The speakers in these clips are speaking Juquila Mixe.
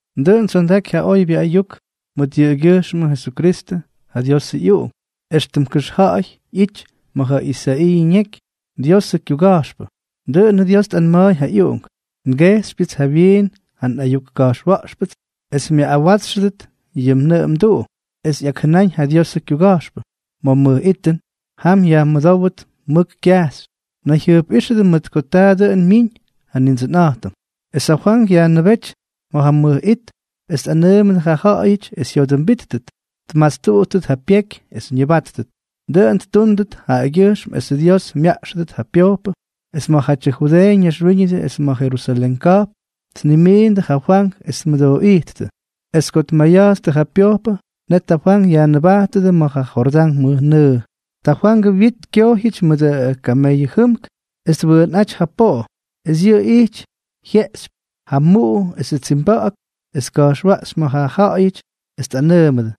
Dʉꞌʉn tsyondaky ja oybyʉ ayuk mʉt yʉꞌʉgyʉjxmʉ Jesukristʉ, ja Diosʉ ꞌyUꞌunk, éxtʉm kʉxja̱ꞌa̱y ꞌyity ma̱ ja Isaiiʉ ñeky, Diosʉ kyuga̱jxpʉ. Dʉꞌʉnʉ Dios tꞌanma̱a̱y ja ꞌyUꞌunk: Ngejxypyʉts jawyiin ja nꞌayuk ka̱jxwa̱ꞌxpʉts es myaꞌꞌawátsxʉdʉt yʉ mnʉꞌʉ mduꞌu. Es ꞌyakjʉnáñ ja Diosʉ kyuga̱jxpʉ: “Ma̱ mʉj itʉn, jam yajmʉdówʉt mʉk kyajxy: Nayjyʉjpꞌíxʉdʉ mʉt ko taa dʉꞌʉn myiñ ja Nindsʉnꞌa̱jtʉm.” Es ja Fwank yajnʉbejty ma̱ ja mʉj it es tꞌanʉʉmʉdʉ ja ja̱ꞌa̱yʉty es jyodʉmbíttʉt, tmastuꞌuttʉt ja pyeky es ñʉbátʉt. Dʉꞌʉn ttúndʉt jaꞌagyʉjxm esʉ Dios myaꞌxʉdʉt ja pyojpʉ. Es ma̱jatyʉ Judeeʉ ñaxwíñʉdʉ es ma̱ Jerusalén ka̱jpn tnimiindʉ ja Fwank es tmʉdooꞌíttʉ. Es ko tmayatstʉ ja pyojpʉ, net ja Fwank yajnʉbátʉdʉ ma̱ ja Jordán mʉjnʉʉ. Ja Fwangʉ wyit kyojyʉty mʉdʉ kameyʉ jʉmk es twʉʉnꞌáty ja poꞌo, es yʉꞌʉ ijty jyeꞌxypy ja muꞌu esʉ tsimba̱ꞌa̱k, es tka̱jxwaꞌxy ma̱ ja ja̱ꞌa̱yʉty es tꞌanʉʉmʉdʉ: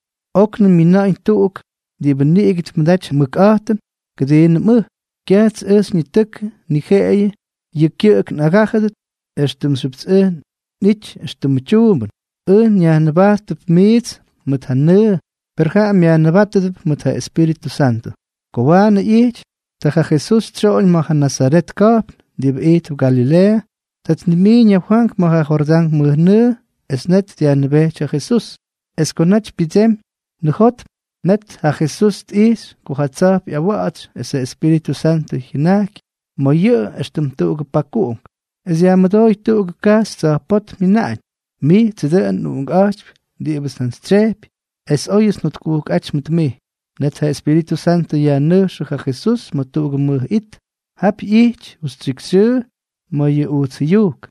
—Oknʉm myina̱ꞌa̱ñ tuꞌugʉ diꞌibʉ niꞌigʉ tmʉdaty ja mʉkꞌa̱jtʉn kʉdiinʉm ʉj. Kyajts ʉj xyñitʉkʉ, ni jeꞌeyʉ yʉ kyʉꞌʉk ngaꞌꞌagájʉdʉt éxtʉmxyʉpts ʉj nꞌítyʉts tyuumbʉn. Ʉj nyajnʉbajttʉpts miits mʉt ja nʉʉ, per jaꞌa myajnʉbátʉdʉp mʉt ja Espíritʉ Santʉ. Ko waanʉ ꞌyity, ta ja Jesús tsyoꞌoñ ma̱ ja Nazaret ka̱jpn diꞌibʉ ijtp Galileeʉ. Ta tnimiiñ ja Fwank ma̱ ja Jordán mʉjnʉʉ, es net dyajnʉbejty ja Jesús. Es ko naty pyʉdsemy nʉjotm, net ja Jesús tꞌijxy ko ja tsa̱jp ꞌyawatsy es ja Espíritʉ Santʉ jyʉnajky ma̱ yʉꞌʉ éxtʉm tuꞌugʉ pakuꞌunk. Es yajmʉdóy tuꞌugʉ kajxy tsa̱jpótm jyʉnaꞌañ: —Mijtsʉ dʉꞌʉn nꞌUꞌunkꞌa̱jtypy diꞌibʉts njantsytsyejpy, es óyʉts njotkujkꞌáty mʉt mij. Net ja Espíritʉ Santʉ yajnʉjxʉ ja Jesús ma̱ tuꞌugʉ mʉj it. Jap ꞌyijty justyikxyxyʉʉ ma̱ yʉ ujts jʉyujk,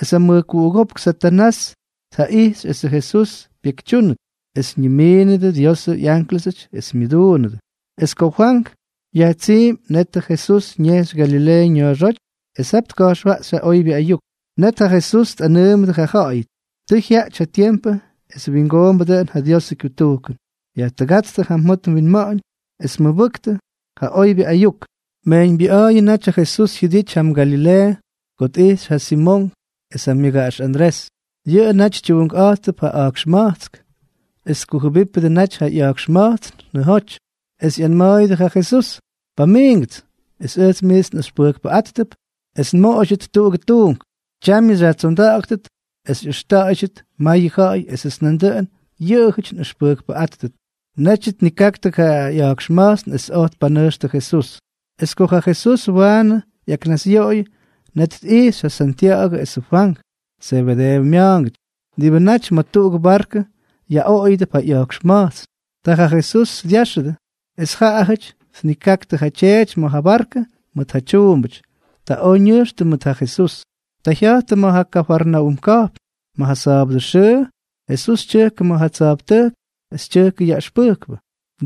es ja mʉjkuꞌugópk Satanás tjaꞌijxy esʉ Jesús pyekytyúnʉt. Es ñimiinʉdʉ Diosʉ ꞌyánklʉsʉty es myʉduunʉdʉ. Es ko Fwank yajtsiimy, net ja Jesús ñejxy Galileeʉ ña̱a̱xóty es jap tka̱jxwaꞌxy ja oybyʉ ayuk. Net ja Jesús tꞌanʉʉmʉdʉ ja ja̱ꞌa̱yʉty: —Tʉ jyaꞌty ja tiempʉ es wingoombʉ dʉꞌʉn ja Diosʉ kyutujkʉn. Yajtʉgátstʉ ja mjot mwinma̱ꞌa̱ñ es mʉbʉktʉ ja oybyʉ ayuk. Mejyñbyʉꞌa̱a̱yʉ naty ja Jesús jyʉdity jam Galileeʉ ko tꞌijxy ja Simonk es ja myʉgaꞌax Andrés. Yʉꞌʉ naty tyuunkꞌa̱jttʉp ja a̱jkxma̱jtsk, es tkujʉbípʉdʉ naty ja ꞌya̱jkxma̱jtsn nʉjoty. Es ꞌyanma̱a̱yʉdʉ ja Jesús: —Pamiingʉts, es ʉjts miits nꞌʉxpʉjkpʉꞌáttʉp es nmoꞌoydyʉt jatuꞌugʉ tuunk. Tyamyʉ xyajtsonda̱ꞌa̱ktʉt es xyꞌʉxta̱ꞌa̱ydyʉt mayʉ ja̱ꞌa̱y esʉts nandʉꞌʉn yʉꞌʉjʉty nꞌʉxpʉjkpʉꞌáttʉt. Netyʉ tnikaktʉ ja ꞌya̱jkxma̱jtsn es oj tpanʉjxtʉ ja Jesús. Es ko ja Jesús waanʉ ꞌyaknasꞌyoꞌoyʉ, net tꞌijxy ja Santya̱ꞌa̱gʉ esʉ Fwank, Zebedeeʉ mya̱a̱ngʉty, diꞌibʉ naty ma̱ tuꞌugʉ barkʉ yaꞌoꞌoyʉdʉp ja ꞌya̱jkxma̱jtsn. Ta ja Jesús dyáxʉdʉ, es jaꞌajʉty tnikaktʉ ja tyeety ma̱ ja barkʉ mʉt ja tyuumbʉty. Ta oj ñʉjxtʉ mʉt ja Jesús. Ta jya̱jttʉ ma̱ ja Kafarnaúm ka̱jpn. Ma̱ ja sa̱a̱bʉdʉ xʉʉ Jesús tyʉjkʉ ma̱ ja tsa̱jptʉjk es tyʉjkʉ yaꞌʉxpʉjkpʉ.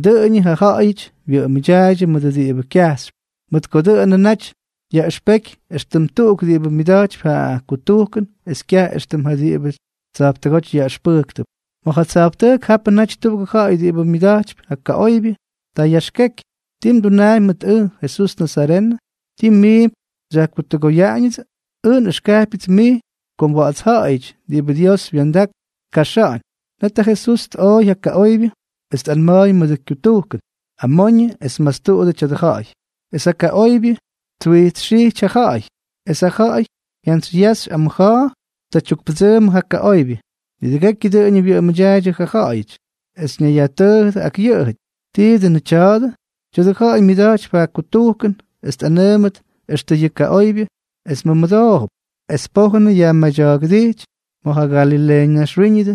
Dʉꞌʉñʉ ja ja̱ꞌa̱yʉty wyʉꞌʉmʉdyaaydyʉ mʉdʉ diꞌibʉ kyajxypy, mʉt ko dʉꞌʉnʉ naty yaꞌʉxpeky éxtʉm tuꞌuk diꞌibʉ myʉda̱jtypy ja kutujkʉn es kyaj éxtʉm ja diꞌibʉty tsa̱jptʉgóty yaꞌʉxpʉjktʉp. Ma̱ ja tsa̱jptʉjk japʉ naty tuꞌugʉ ja̱ꞌa̱y diꞌibʉ myʉda̱jtypy ja kaꞌoybyʉ. Ta yaxkeky: —¿Ti mdunaampy mʉt ʉj, Jesús nazarenʉ? ¿Tii mmiimp xyajkutʉgoyaꞌañʉdsʉ? Ʉj nꞌʉxkajpyʉts mij ko mwa̱ꞌa̱tsja̱ꞌa̱yʉty diꞌibʉ Dios wya̱ndak tkaxa̱ꞌa̱ñ. Net ja Jesús tꞌooy ja kaꞌoybyʉ, es tꞌanma̱a̱y mʉdʉ kyutujkʉn: —¡Amoñʉ es mastuꞌudʉ tya̱dʉ ja̱ꞌa̱y! Es ja kaꞌoybyʉ twijtsxijty ja ja̱ꞌa̱y, es ja ja̱ꞌa̱y jyantsyyaxy amʉja̱a̱, ta tyukpʉdsʉʉmʉ ja kaꞌoybyʉ. Nidʉgekyʉ dʉꞌʉñʉ wyʉꞌʉmʉdyaaydyʉ ja ja̱ꞌa̱yʉty, es ñayyajtʉʉjʉdʉ ak yʉꞌʉjʉty: —¿Tii dʉnʉ tya̱a̱dʉ? ¡Tya̱dʉ ja̱ꞌa̱y myʉda̱jtypy ja kutujkʉn es tꞌanaꞌamʉt extʉ yʉ kaꞌoybyʉ, es mʉmʉdoojʉp! Es pojʉn yajmadya̱a̱gʉdijty ma̱ ja Galileeʉ naxwíñʉdʉ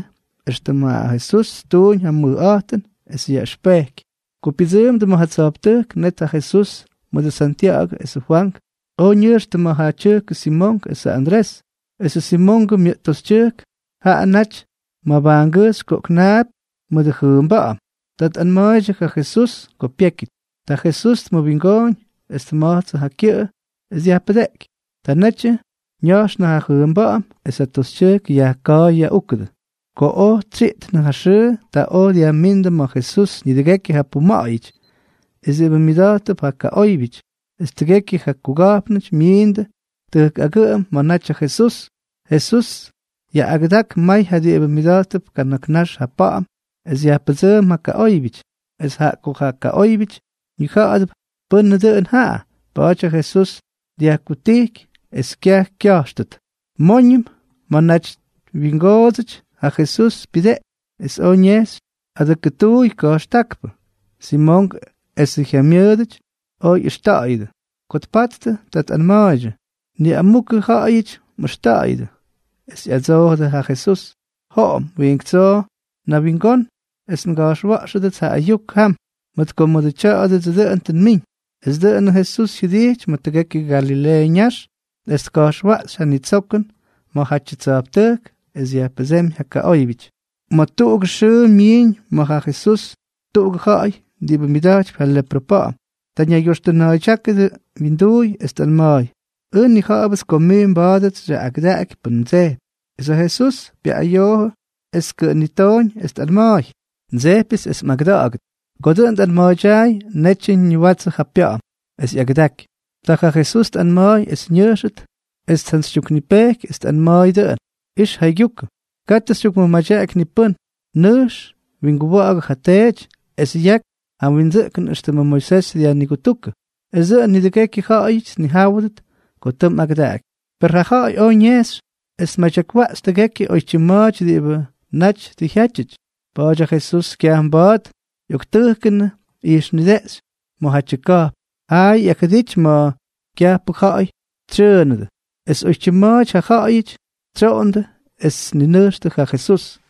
éxtʉm ja Jesús ttuñ ja mʉjꞌa̱jtʉn es yaꞌʉxpeky. Ko pyʉdsʉʉmdʉ ma̱ ja tsa̱jptʉjk, net ja Jesús mʉdʉ Santya̱ꞌa̱gʉ esʉ Fwank oj ñʉjxtʉ ma̱ ja tyʉjkʉ Simonk esʉ Andrés. Esʉ Simongʉ myʉꞌt toxytyʉjk jaꞌa naty mabajngʉjxy koꞌknaapy mʉdʉ jʉʉmba̱ꞌa̱m. Ta tꞌanma̱a̱ydyʉ ja Jesús ko pyékyʉty. Ta ja Jesús tmʉwingooñ, es tma̱jtsʉ ja kyʉꞌʉ es dyajpʉdeꞌky. Ta netyʉ ña̱jxnʉ ja jʉʉmba̱ꞌa̱m, es ja toxytyʉjk yajka̱a̱y yaꞌúkʉdʉ. Ko oj tsyiꞌtnʉ ja xʉʉ, ta oj dyajmíndʉ ma̱ Jesús nidʉgekyʉ ja puma̱ꞌa̱yʉty es diꞌibʉ myʉda̱jttʉp ja kaꞌóybyʉty, es tʉgekyʉ ja kuga̱jpnʉty myiindʉ tʉjk agʉꞌʉm ma̱ naty ja Jesús. Jesús yaꞌꞌagʉdak may ja diꞌibʉ myʉda̱jttʉp kana̱k nax ja pa̱ꞌa̱m es yajpʉdsʉʉm ja kaꞌóybyʉty. Es jaꞌa ko ja kaꞌóybyʉty ñija̱ꞌa̱dʉp pʉ́nʉ dʉn jaꞌa, pa̱a̱ty ja Jesús dyajkutijky es kyaj kya̱jxtʉt. Móñʉm, ma̱a̱nʉmʉ naty wyingoodsʉty, ja Jesús pyʉdeꞌky es oj ñejxy adʉkʉtuuy ka̱jxtákpʉ. Simonk esʉ jyamyʉʉdʉty oj ꞌyʉxta̱ꞌa̱yʉdʉ. Ko tpattʉ, ta tꞌanma̱a̱ydyʉ: —Niꞌamukʉ ja̱ꞌa̱yʉty mꞌʉxta̱ꞌa̱yʉdʉ. Es ꞌyadsoojʉdʉ ja Jesús: —Joꞌom wiink tsoo nawingón es nga̱jxwa̱ꞌxʉdʉts ja ayuk jam, mʉt ko mʉdʉ tya̱a̱dʉdsʉ dʉꞌʉn tʉ nmiñ. Es dʉꞌʉnʉ Jesús jyʉdijty ma̱ tʉgekyʉ Galileeʉ ñax es tka̱jxwaꞌxy ja nitsokʉn ma̱jatyʉ tsa̱jptʉjk es dyajpʉdsémy ja kaꞌóybyʉty. Ma̱ tuꞌugʉ xʉʉ myiiñ ma̱ ja Jesús tuꞌugʉ ja̱ꞌa̱y diꞌibʉ myʉda̱jtypy ja leprʉ pa̱ꞌa̱m. Ta ñaygyoxtʉna̱a̱ydyákʉ wyinduuy es tꞌanma̱a̱y: —Ʉj nnija̱ꞌa̱bʉts ko mij mba̱a̱dʉts xyaꞌꞌagʉdaꞌaky pʉn mdsejpy. Es ja Jesús pyaꞌꞌayoojʉ es tkʉꞌʉnitooñ es tꞌanma̱a̱y: —Ndsejpyʉts es mꞌagʉda̱ꞌa̱gʉt. Ko dʉꞌʉn tꞌanma̱a̱ydyaay, netyʉ ñiwatsʉ ja pya̱ꞌa̱m es ꞌyagʉdaky. Ta ja Jesús tꞌanma̱a̱y es ñʉjxʉt, es tjantsytyuknipejky es tꞌanma̱a̱y dʉꞌʉn: —Ix jaygyukʉ. Katʉ xytyukmʉmadyaꞌaky ni pʉ́n. Nʉjx winguwa̱ꞌa̱gʉ ja teety, es yak ja mwindsʉꞌkʉn éxtʉmʉ Moisés dyajnigutujkʉ, es dʉꞌʉn nidʉgekyʉ ja̱ꞌa̱yʉty tnijáwʉdʉt ko tʉ mꞌagʉdaꞌaky. Per ja ja̱ꞌa̱y oj ñejxy es tmadyakwaꞌxy tʉgekyʉ oytyim ma̱a̱ty diꞌibʉ naty tʉ jyátyʉty. Pa̱a̱ty ja Jesús kyaj mba̱a̱t ꞌyoktʉjkʉnʉ ijxnideꞌxy ma̱jatyʉ ka̱jpn, jaayʉ ꞌyakjʉdity ma̱ kyajpʉ ja̱ꞌa̱y tsyʉʉnʉdʉ. Es oytyim ma̱a̱ty ja ja̱ꞌa̱yʉty tsyoondʉ es tninʉjxtʉ ja Jesús.